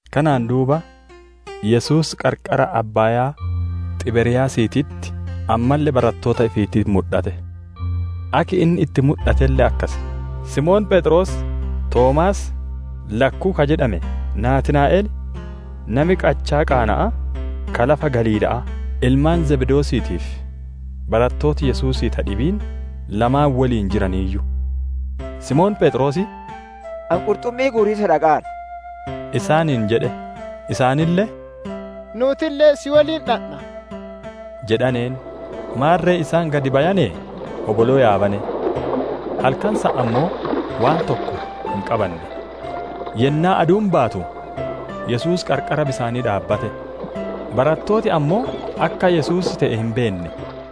Kanaan duuba, Yesuus qarqara abbaayaa Xiberiyaasiititti ammalle barattoota ifiititti mudhate. Akki inni itti mudhatelle akkas: Simoon Pheexroos, Toomaas, «Lakkuu» ka jedhame, Naataanaa'el nami qachaa Qaana'aa ka lafa Galiila'aa, ilmaan Zabdewoosiitii fi barattooti Yesuusii ta dhibiin lamaan woliin jiraniiyyu. Simoon Pheexroos, «Ani qurxummii guuriisa dhaqaara» isaaniin jedhe. Isaanille, «Nuutille si woliin dhandhaa» jedhaneen. Maarre isaan gad bayanee hoboloo yaabane. Halkan san ammoo waan tokko hin qabanne. Yennaa aduun baatu, Yesuus qarqara bisaanii dhaabbate; barattooti ammoo akka Yesuus te'e hin beenne.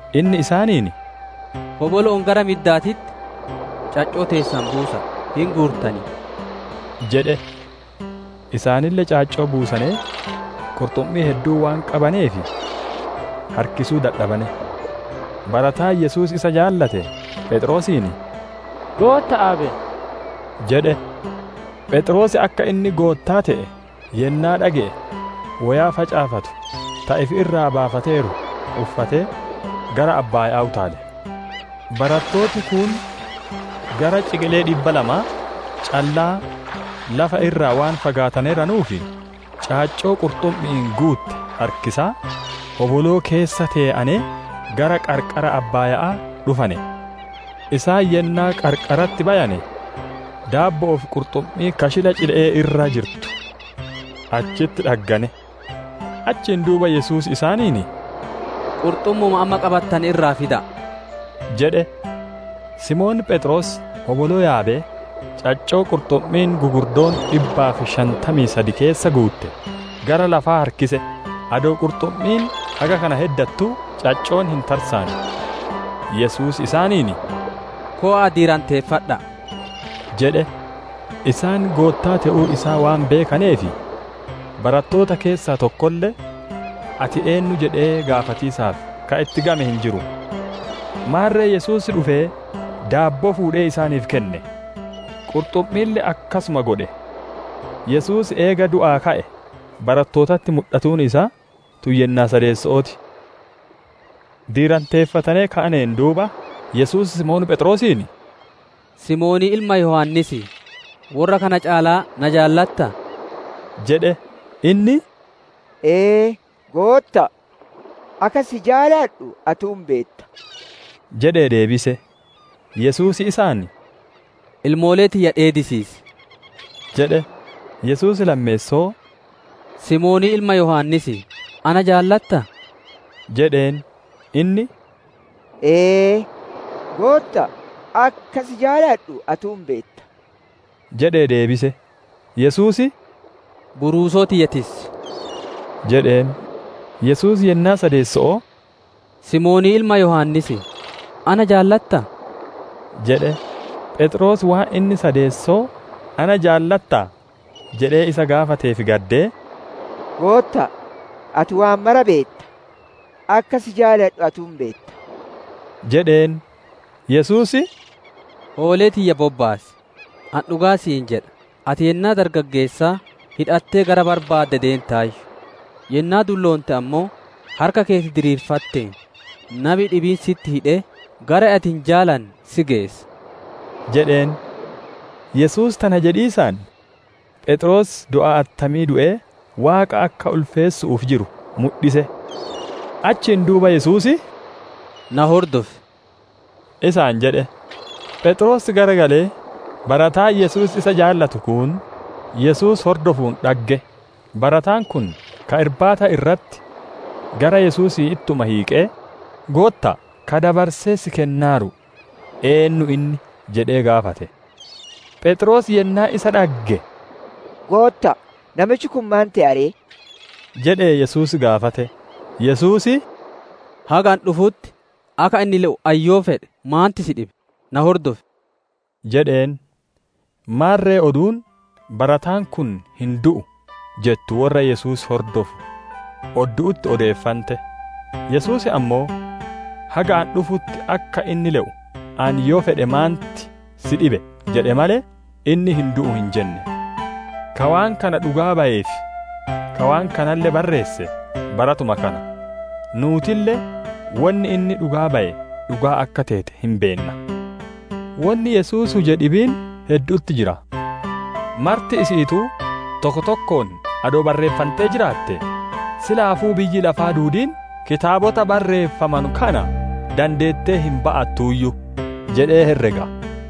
Inni isaaniin, «Hobolo'oon gara middaatitti caccoo teessan buusa'a, hin guurattan» jedhe. Isaanille caccoo buusanee qurxummii hedduu waan qabaneef, harkisuu dadhabane. Barataan Yesuus isa jaalate, Pheexroosiin, «Gootta'aa be!» jedhe. Pheexroos akka inni Goottaa te'e yennaa dhage'e, woyaa facaafatu ta ifi irraa baafateeru uffatee gara abbaaya'aa utaale. Barattooti kuun gara ciqilee dhibba lamaa callaa lafa irraa waan fagaataneeranuuf, caccoo qurxummiin guutte harkisaa, hoboloo keessa tee'anee, gara qarqara abbaaya'aa dhufane. Isaan yennaa qarqaratti bayane, daabbo'oo fi qurxummii kashila cile'ee irra jirtu achitti dhaggane. Achiin duuba Yesuus isaaniin, «Qurxummuma amma qabattane irraa fida'a» jedhe. Simoon Pheexroos hoboloo yaabee, caccoo qurxummiin gugurdoon dhibbaa fi shantamii sadii keessa guutte, gara lafaa harkise; adoo qurxummiin haga kana heddattuu, caccoon hin tarsaane. Yesuus isaaniin, «Kowa'aa diiranteeffadha'a!» jedhe. Isaan Goottaa te'uu isaa waan beekaneef, barattoota keessaa tokkolle, «Ati eennu?» jedhee gaafatiisaaf ka itti game hin jiru. Maarre Yesuus dhufee, daabboo fuudhee, isaaniif kenne; qurxummiille akkasuma godhe. Yesuus eega du'aa ka'e, barattootatti mudhatuun isaa tun yennaa sadeesso'oo ti. Diiranteeffatanee ka'aneeranuun duuba, Yesuus Simoon Pheexroosiin, «Simoonii ilma Yohaannisii, worra kana caalaa na jaalattaa?» jedhe. Inni, «Ee, Goottaa, akka si jaaladhu atuu hin beetta» jedhee deebise. Yesuus isaan, «Ilmoolee tiyya dheedisiisi» jedhe. Yesuus lammeessoo, «Simoonii ilma Yohaannisii, na jaalattaa?» jedheen. Inni, «Ee, Gootta'a, akka si jaaladhu atuu hin beetta» jedhee deebise. Yesuus, «Buruusoo tiyya tissi» jedheen. Yesuus yennaa sadeesso'oo, «Simoonii ilma Yohaannisii, na jaalatta?» jedhe. Pheexroos waan inni sadeessoo, «Ana jaalattaa?» jedhee isa gaafateef gaddee, «Gootta'a, ati waan mara beetta; akka si jaaladhu atuu hin beetta» jedheen; Yesuus, «Hoolee tiyya bobbaasi. Ani dhugaa si'iin jedha: Ati yennaa dargaggeessaa, hidhattee gara barbaadde deentaayyu; yennaa dulloonte ammoo, harka keeti diriirfatteen, nami dhibiin sitti hidhee gara ati hin jaalanne si geessa» jedheen. Yesuus tana jedhiisaan, Pheexroos du'a attamii du'ee Waaqa akka ulfeessu'uuf jiru mudhise. Achiin duuba Yesuus, «Na hordofi!» isaan jedhe. Pheexroos garagalee barataan Yesuus isa jaalatu kuun Yesuus hordofuun dhagge; barataan kun ka irbaata irratti gara Yesuusii ittuma hiiqee, «Gootta'a, ka dabarsee si kennaaru eennu inni?» jedhee gaafate. Pheexroos yennaa isa dhagge, «Gootta'a, namichi kun maan te'a ree?» jedhee Yesuus gaafate. Yesuus, «Haga ani dhufutti akka inni le'u ani yoo fedhe maanti si dhibe? Na hordofi» jedheen. Maarre oduun, «Barataan kun hin du'u» jettu worra Yesuus hordofu oddu'utti odeeffante. Yesuus ammoo, «Haga ani dhufutti akka inni le'u ani yoo fedhe maanti si dhibe?» jedhe malee, inni hin du'u hin jenne. Ka waan kana dhugaa bayee fi ka waan kanalle barreesse baratuma kana; nuutille wonni inni dhugaa baye dhugaa akka teete hin beenna. Wonni Yesuus huje dhibiin heddu'utti jira. Marti isi'iituu tokko tokkoon adoo barreeffantee jiraattee, silaafuu biyyi lafaa duudiin kitaabota barreeffamanu kana dandeettee hin ba'attuuyyuu jedhee herrega.